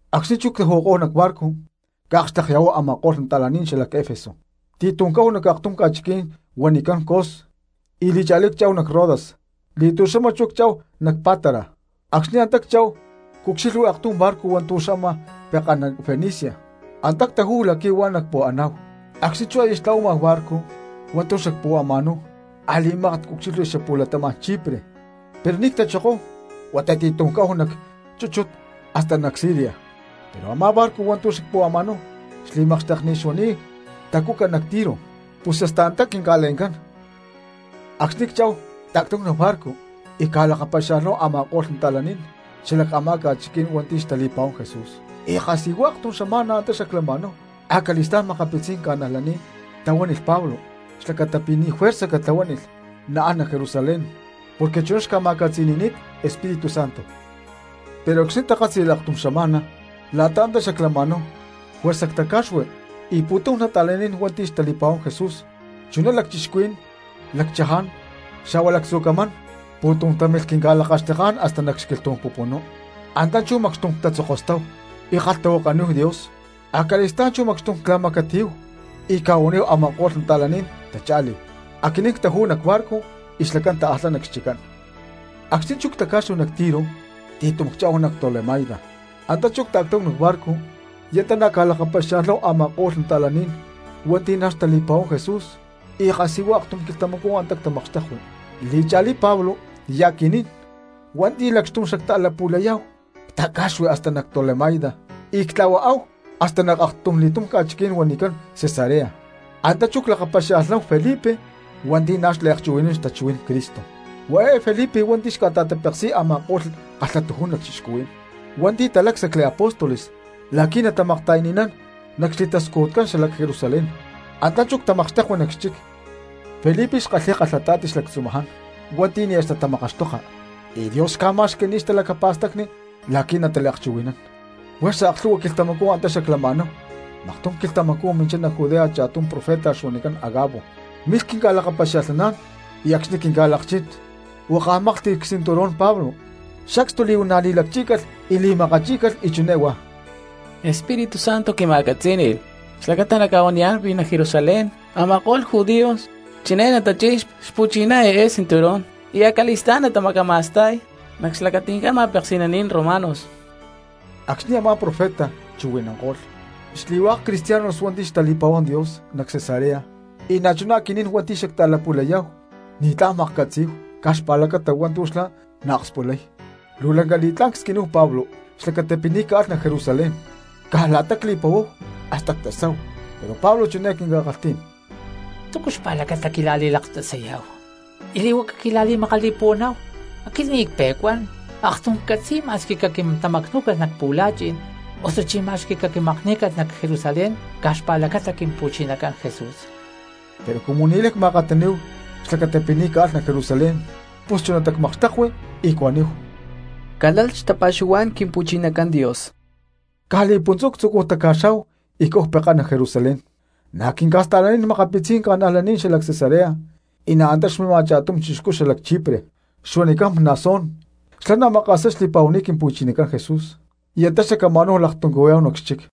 Acxni̠ chú ctaju̠kó̠hu nac barco cca̠akxtekya̠huáhu a̠ma̠ko̠lh nata̠lán xalac Efeso, ti̠tum cáhu nac aktum ca̠chiquí̠n huanicán Cos, y li̠cha̠lí cchá̠hu nac Rodas, li̠tu̠xama chú cchá̠hu nac Pátara. Acxni̠ antá cchá̠hu, cucxilhui aktum barco hua̠ntu̠ xama pekán nac Fenicia, antá ctajú̠hu la̠qui̠ huá nacpu̠aná̠hu. Acxni̠ chú aya xtla̠huama barco hua̠ntu̠ xacpu̠ama̠náhu a̠li̠mákat cucxilhui cxapu̠latama̠n Chipre, pero ni̠ ctachokóhu huata ti̠tum cáhu nac chúchut hasta nac Siria. Pero a̠má barco hua̠ntu̠ xacpu̠ama̠náhu xli̠makxteknit xuani̠t tacuca nac Tiro, pus hasta antá quinca̠le̠ncán. Acxni̠ cchá̠hu, cta̠ctáhu nac barco y cca̠lakapaxia̠lhnáhu a̠ma̠ko̠lh cristianos xala a̠má ca̠chiquí̠n hua̠nti̠ xtali̠pa̠huán Jesús, y kasijua aktum xama̠na antá xaclama̠náhu. Acali̠stá̠n makapitzí̠n ca̠najlaní̠n tahuánilh Pablo xlacata pi̠ ni̠ juerza catlahuánilh naán nac Jerusalén porque chuná xca̠ma̠catzi̠ni̠ni̠t Espíritu Santo. Pero acxni̠ takátzi̠lh aktum xama̠na la̠ta antá xaclama̠náhu juerza ctaca̠xui y pu̠tum cristianos hua̠nti̠ xtali̠pa̠huán Jesús chuná lacchixcuhuí̠n, lacchaján, xa̠hua lactzu̠ camán pu̠tum támilh quinca̠lakaxteká̠n hasta nac xquilhtú̠n pupunú; antá chú macxtum ctatzokostáhu y ckalhtahuakaníhu Dios. Acali̠stá̠n chú macxtum cla̠macatiyáhu y cca̠huaníhu a̠ma̠ko̠lh cristianos tacha̠lí, aquinín ctajú̠hu nac barco y xlacán taalhá nac xchiccán. Acxni̠ chú ctaca̠xui nac Tiro ti̠tum cchá̠hu nac Tolemaida, antá chú cta̠ctáhu nac barco y antá na̠ cca̠lakapaxia̠lhnáhu a̠ma̠ko̠lh cristianos hua̠nti̠ na̠ xtali̠pa̠huán Jesús y kasijua aktum quilhtamacú antá ctamakxtekui. Li̠cha̠lí Pablo y aquinín hua̠nti̠ lacxtum xacta̠lapu̠layá̠hu ctaca̠xui nac Tolemaida y ctla̠huaáhu hasta nac aktumli̠tum ca̠chiquí̠n huanicán Cesarea. Antá chú clakapaxia̠lhnáhu Felipe hua̠nti̠ na̠ xliakchuhui̠nán xtachuhuí̠n Cristo. Huá eé Felipe hua̠nti̠ xca̠ta̠tapeksi̠y a̠ma̠ko̠lh kalhatujún lacchixcuhuí̠n hua̠nti̠ talácsacli apóstoles la̠qui̠ natamakta̠yani̠nán nac xli̠tascujutcán xalac Jerusalén; antá chú ctamakxtekui nac xchic. Felipe xkalhi̠y kalhata̠ti xlactzumaján hua̠nti̠ nia̠ xtatamakaxtoka, y Dios xca̠ma̠xqui̠ni̠t xtalacapa̠stacni la̠qui̠ nataliakchuhui̠nán. Juerza aklhu̠hua quilhtamacú antá xaclama̠náhu y maktum quilhtamacú minchá nac Judea cha̠tum profeta xuanicán Agabo. Milh quinca̠lakapaxia̠lhnaná̠n y acxni̠ quinca̠lakchín huakaj máklhti̠lh csinturón Pablo, sacstu li̠huana̠ li̠lacchí̠calh y li̠macachí̠calh, y chiné huá: —Espíritu Santo quima̠catzí̠ni̠lh xlacata nacca̠huaniyá̠n pi̠ nac Jerusalén a̠ma̠ko̠lh judíos chiné natachi̠y xpu̠chiná eé cinturón, y acali̠stá̠n natamacama̠sta̠y nac xlacati̠ncán ma̠peksi̠naní̠n romanos. Acxni̠ a̠má profeta chuhui̠nanko̠lh, xli̠hua̠k cristianos hua̠nti̠ xtali̠pa̠huán Dios nac Cesarea y na̠chuná aquinín hua̠nti̠ xacta̠lapu̠layá̠hu ni̠tlá̠n cmaklhcatzí̠hu caj xpa̠lacata hua̠ntu̠ xlá naakspulay, luu lanca li̠tlá̠n csquiníhu Pablo xlacata pi̠ ni̠ caalh nac Jerusalén; caj la̠ta cli̠puhuáhu hasta ctasáhu. Pero Pablo chiné quinca̠kalhtí̠n: —¿Túcu xpa̠lacata quila̠li̠laktasayá̠hu y li̠huaca quila̠li̠makali̠puhuaná̠hu? Aquit ni̠ cpe̠cuán, aktum ccatzi̠y ma̠squi caquintamacnú̠calh nac pu̠la̠chi̠n osuchí ma̠squi caquimakní̠calh nac Jerusalén caj xpa̠lacata Quimpu̠chinacán Jesús. Pero cumu ni̠láy cma̠akataní̠hu xlacata pi̠ ni̠ caalh nac Jerusalén pus chunatá cmakxtekui y cuaníhu: —Calalh xtapa̠xuhuá̠n Quimpu̠chinacán Dios. Caj li̠puntzú ctzucúhu taca̠xá̠hu y cáhu pekán nac Jerusalén. Na̠ quinca̠sta̠lanín makapitzí̠n ca̠najlaní̠n xalac Cesarea, y na̠ antá xmima cha̠tum chixcú xalac Chipre xuanicán Mnasón, xlá na̠ maka̠sá xli̠pa̠huani̠t Quimpu̠chinacán Jesús y antá xacama̠náhu laktuncuhuiyá̠hu nac xchic.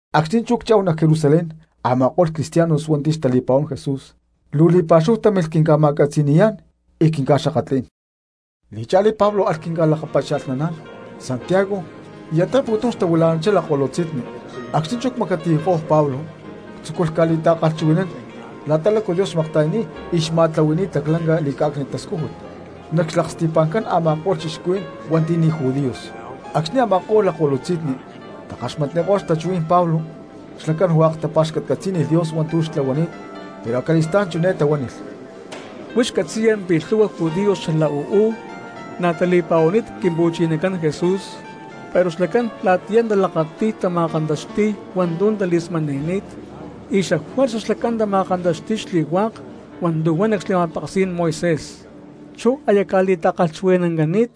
Acxni̠ chú cchá̠hu nac Jerusalén a̠ma̠ko̠lh cristianos hua̠nti̠ xtali̠pa̠huán Jesús luu li̠pa̠xúhu támilh quinca̠macatiyayá̠n y quinca̠xakatlí̠n. Li̠cha̠lí Pablo alh quinca̠ta̠lakapaxia̠lhnaná̠n Santiago y antá pu̠tum xtahuila̠nanchá lakko̠lutzi̠nni. Acxni̠ chú cca̠macatiyakó̠hu Pablo tzúculh ca̠li̠ta̠kalhchuhui̠nán la̠ta lácu Dios xmakta̠yani̠t y xma̠tlahui̠ni̠t laclanca li̠cá̠cni̠t tascújut nac xlaksti̠pa̠ncán a̠ma̠ko̠lh cristianos hua̠nti̠ ni̠ judíos. Acxni̠ a̠ma̠ko̠lh lakko̠lutzi̠nni takaxmatniko̠lh xtachuhuí̠n Pablo xlacán hua̠k tapa̠xcatcatzí̠nilh Dios hua̠ntu̠ xtlahuani̠t. Pero acali̠stá̠n chiné tahuánilh: —Huix catzi̠ya pi̠ lhu̠hua judíos xala uú na̠ tali̠pa̠huani̠t Quimpu̠chinacán Jesús pero xlacán la̠tiyá talakati̠y tama̠kantaxti̠y hua̠ntu̠ tali̠smani̠ni̠t y xafuerza xlacán tama̠kantaxti̠y xli̠hua̠k hua̠ntu̠ huan nac xli̠ma̠peksí̠n Moisés. Chú aya ca̠li̠ta̠kalhchuhui̠nancani̠t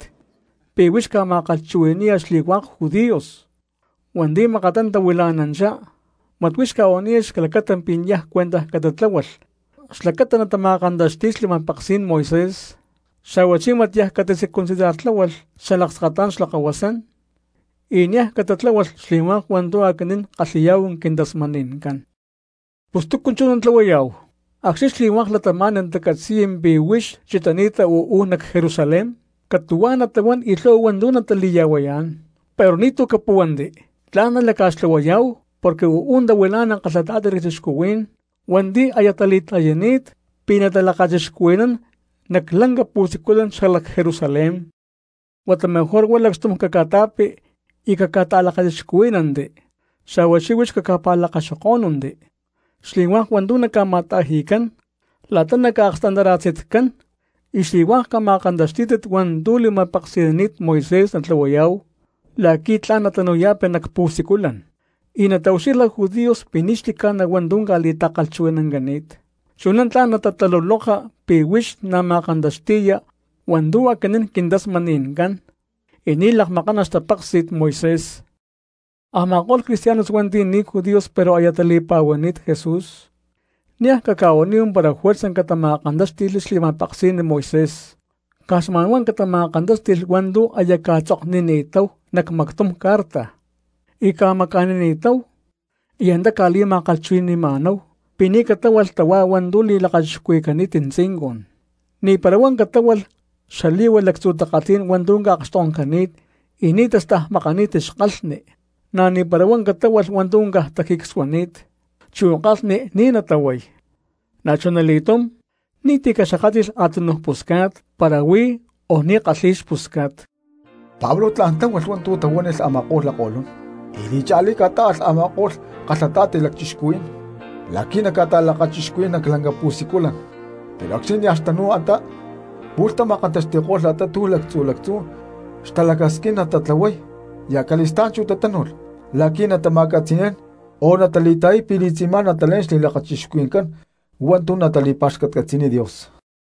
pi̠ huix ca̠ma̠kalhchuhui̠ni̠ya xli̠hua̠k judíos hua̠nti̠ makattá tahuila̠nanchá, mat huix ca̠huaniya xlacata pi̠ niaj cuentaj catatláhualh xlacata natama̠kantaxti̠y xli̠ma̠peksí̠n Moisés, xa̠huachí mat niaj catacircuncidartláhualh xalakskatá̠n xlakahuasán, y niaj catatláhualh xli̠hua̠k hua̠ntu̠ aquinín ckalhi̠yá̠hu quintasmani̠ncán. Pus ¿túcu chú natlahuayá̠hu? Acxni̠ xli̠hua̠k cristianos natacatzi̠y pi̠ huix chitani̠ta uú nac Jerusalén catu̠huá natahuán y lhu̠hua hua̠ntu̠ natali̠ya̠huayá̠n. Pero ni̠tu̠ capúhuanti, tla̠n nalaca̠xtlahuayá̠hu, porque uú tahuilá̠nalh kalhata̠ti lacchixcuhuí̠n hua̠nti̠ aya tali̠ta̠yani̠t pi̠ natalakachixcuhui̠nán nac lanca pu̠siculan xalac Jerusalén. Huata mejor huá lacxtum caca̠ta̠pi y caca̠ta̠lakachixcuhuí̠nanti, xa̠huachí huix caca̠pa̠lakaxokó̠nunti xli̠hua̠k hua̠ntu̠ naca̠ma̠ta̠ji̠cán la̠ta naca̠akstantarasitcán, y xli̠hua̠k cama̠kantaxtí̠tit hua̠ntu̠ li̠ma̠peksi̠nani̠t Moisés natlahuayá̠hu la̠qui̠ tla̠n natanu̠ya̠pi nac pu̠siculan, y nataucxilha judíos pi̠ ni̠ xli̠ca̠na huantú ca̠li̠ta̠kalhchuhui̠nancani̠t. Chuná tla̠n natataluloka pi̠ huix na̠ ma̠kantaxti̠ya hua̠ntu̠ aquinín quintasmani̠ncán y ni̠ lakmakana xtapéksi̠t Moisés. Pero a̠ma̠ko̠lh cristianos hua̠nti̠ ni̠ judíos pero aya tali̠pa̠huani̠t Jesús, niaj caca̠huaníhu para juerza catama̠kantáxti̠lh xli̠ma̠peksí̠n Moisés, caj xma̠nhuá catama̠kantáxti̠lh hua̠ntu̠ aya cca̠tzoknini̠táhu nac mactum carta y cca̠maca̠nini̠táhu y antá cca̠li̠ma̠kalhchuhui̠ní̠hu pi̠ ni̠ catáhualh tahuá hua̠ntu̠ li̠lakachixcuhui̠cani̠t tzincun, ni̠para huá catáhualh xali̠hua lactzu takalhí̠n hua̠ntu̠ ca̠akxtonkcani̠t y ni̠ tastajmakani̠t xkalhni, na̠ ni̠para huá catáhualh hua̠ntu̠ tajicsuani̠t, chu kalhni ni̠ natahuay, na̠chuna li̠túm ni̠ti̠ caxakátli̠lh a̠tunuj pusca̠t para huí o ni̠ kalhi̠y xpusca̠t. Pablo tla̠n tláhualh hua̠ntu̠ tahuánilh a̠ma̠ko̠lh lakko̠lun, y li̠cha̠lí ca̠tá̠alh a̠ma̠ko̠lh kalhata̠ti lacchixcuhuí̠n la̠qui̠ naca̠ta̠lakachixcuhui̠nán nac lanca pu̠siculan, pero acxni̠ nia̠ xtanu̠y antá, pu̠lh tama̠kantaxti̠ko̠lh la̠ta túcu lactzu̠ lactzú xtalacasquín natatlahuay y acali̠stá̠n chú tatánu̠lh la̠qui̠ natama̠catzi̠ni̠nán o natali̠ta̠yay pi̠ li̠tzi̠má natalé̠n xli̠lakachixcuhui̠ncán hua̠ntu̠ natali̠pa̠xcatcatzi̠niy Dios.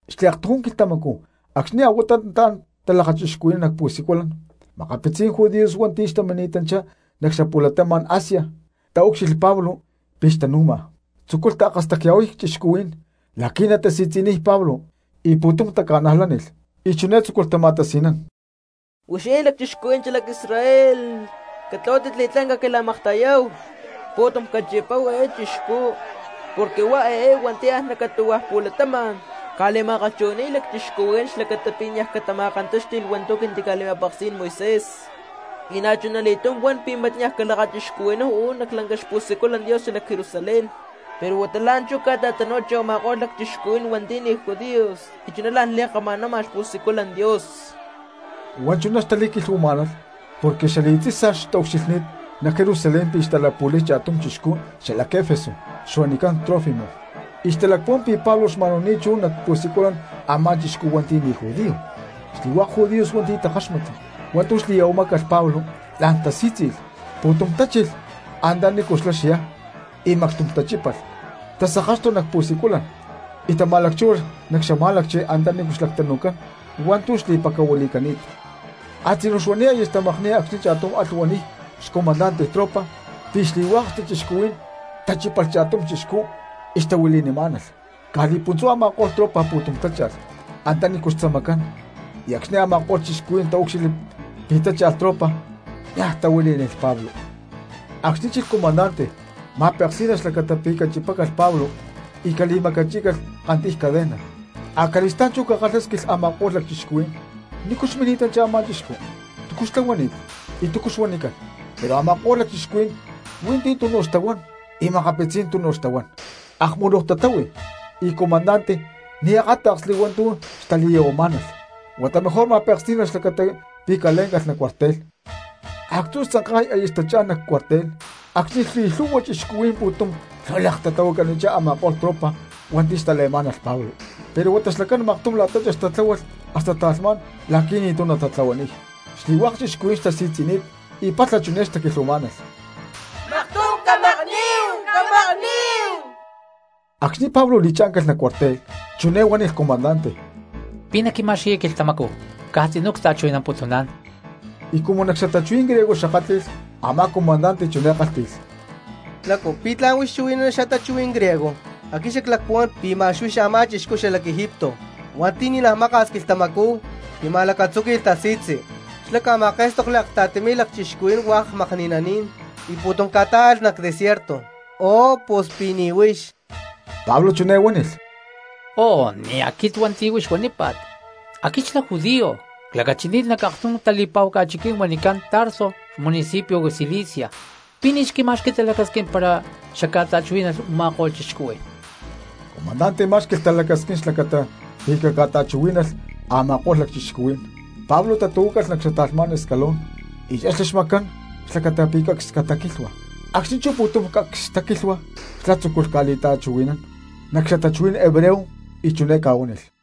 Xliaktujún quilhtamacú acxni̠ a̠huatá nataán talakachixcuhui̠nán nac pu̠siculan, makapitzí̠n judíos hua̠nti̠ xtamini̠tanchá nac xapu̠latama̠n Asia taúcxilhli Pablo pi̠ xtanu̠ma, tzúculh taakastacya̠huay cristianos la̠qui̠ natasi̠tzi̠niy Pablo y pu̠tum taca̠najlánilh. Y chiné tzúculh tama̠tasi̠nán: —¡Huixinín lacchixcuhuí̠n xalac Israel, catlahuátit li̠tlá̠n caquila̠makta̠yáhu! Pu̠tum cachipáhu eé chixcú porque huá eé hua̠nti̠ an nac catu̠hua̠ pu̠latama̠n ca̠li̠ma̠kalhchuhui̠ni̠y cristianos xlacata pi̠ niaj catama̠kantáxti̠lh hua̠ntu̠ quintica̠li̠ma̠peksí̠n Moisés, y na̠chuna li̠túm huan pi̠ mat niaj calakachixcuhui̠náhu uú nac lanca xpu̠siculan Dios xalac Jerusalén, pero huata la̠nchú ca̠ta̠tanu̠ni̠tanchi u̠ma̠ko̠lh lacchixcuhuí̠n hua̠nti̠ ni̠ judíos y chuná la̠n li̠kama̠nama xpu̠siculan Dios. Huá chuná xtali̠quilhuamá̠nalh porque xali̠tzi̠sa xtaucxilhni̠t nac Jerusalén pi̠ xta̠lapu̠lay cha̠tum chixcú xalac Efeso xuanicán Trófimo, y xtalacpuhuán pi̠ Pablo xma̠nu̠ni̠t chú nac pu̠siculan a̠má chixcú hua̠nti̠ ni̠ judío. Xli̠hua̠k judíos hua̠nti̠ takáxmatli hua̠ntu̠ xli̠ya̠huamá̠calh Pablo la̠n tasí̠tzi̠lh, pu̠tum tachilh antanícu xlá xyá y macxtum tachípalh, tasakáxtulh nac pu̠siculan y tama̠lacchúhualh cxamá̠lacchi antaní xlactanu̠cán hua̠ntu̠ xli̠pacahuili̠cani̠t. Actzú xuani̠t aya xtamakni̠y acxni̠ cha̠tum alh huaniy xacomandante tropa pi̠ xli̠hua̠k cristianos tachípalh cha̠tum chixcú y xtahuili̠nimá̠nalh. Caj li̠puntzú a̠ma̠ko̠lh tropa pu̠tum tácha̠lh antaní xtzamacán y acxni̠ a̠ma̠ko̠lh cristianos taúcxilhli pi̠ tácha̠lh tropa niaj tahuilí̠nilh Pablo. Acxni chilh comandante ma̠peksí̠nalh xlacata pi̠ cachipácalh Pablo y cali̠macachí̠calh kantiy cadenas, acali̠stá̠n chú ca̠kalhásquilh a̠ma̠ko̠lh cristianos nícu xmini̠tanchá a̠má chixcú, túcu xtlahuani̠t y túcu xuanicán. Pero a̠ma̠ko̠lh cristianos hui̠ntí tunu xtahuán y makapitzí̠n tunu xtahuán, akmuluj tatáhui y comandante ni̠ akáta̠ksli hua̠ntu̠ xtali̠ya̠huamá̠nalh, huata mejor ma̠peksí̠nalh xlacata pi̠ calé̠ncalh nac cuartel. Actzú xtzanka̠y aya xtachá̠n nac cuartel acxni̠ xli̠lhu̠hua cristianos pu̠tum lhuilek tatahuacanichá a̠ma̠ko̠lh tropa hua̠nti̠ xtale̠má̠nalh Pablo, pero huata xlacán maktum la̠ta chex tatláhualh hasta ta̠lhmá̠n la̠qui̠ ni̠tu̠ natatlahuaniy. Xli̠hua̠k cristianos xtasi̠tzi̠ni̠t y palha chiné xtaquilhuamá̠nalh: —¡Maktum camakní̠hu, camakní̠hu! Acxni̠ Pablo li̠chá̠ncalh nac cuartel chiné huánilh comandante: —¿Pi̠ naquima̠xqui̠ya quilhtamacú caj tzinú cta̠chuhui̠namputuná̠n? Y cumu nac xatachuhuí̠n griego xakátli̠lh, amá comandante chiné kálhti̠lh: —¡Lácu! ¿Pi̠ tla̠n huix chuhui̠nana cxatachuhuí̠n griego? Aquit xaclacpuhuán pi̠ ma̠x huix a̠má chixcú xalac Egipto hua̠nti̠ ni̠naj maka̠s quilhtamacú tima̠lacatzúqui̠lh tasi̠tzi, xlá ca̠ma̠ké̠stokli akta̠ti mi̠lh lacchixcuhuí̠n hua̠k makni̠naní̠n y pu̠tum ca̠tá̠alh nac desierto. ¡Oh, pus pi̠ ni̠ huix! Pablo chiné huánilh: —Oh, ni̠ aquit hua̠nti̠ huix huanípa̠t. Aquit xlá judío, clacachini̠t nac aktum tali̠pa̠hu ca̠chiquí̠n huanicán Tarso xmunicipio Cilicia. ¿Pi̠ ni̠ xquima̠xqui talacasquín para xacca̠ta̠chuhuí̠nalh u̠ma̠ko̠lh cristianos? Comandante má̠xqui̠lh talacasquín xlacata pi̠ caca̠ta̠chuhuí̠nalh a̠ma̠ko̠lh cristianos, Pablo tatu̠huácalh nac xata̠lhmá̠n escalón y chexli xmacán xlacata pi̠ cacs cataquílhua. Acxni̠ chú pu̠tum cacs taquílhua xlá tzúculh ca̠li̠ta̠chuhui̠nán nac xatachuhuí̠n hebreo y chiné ca̠huánilh: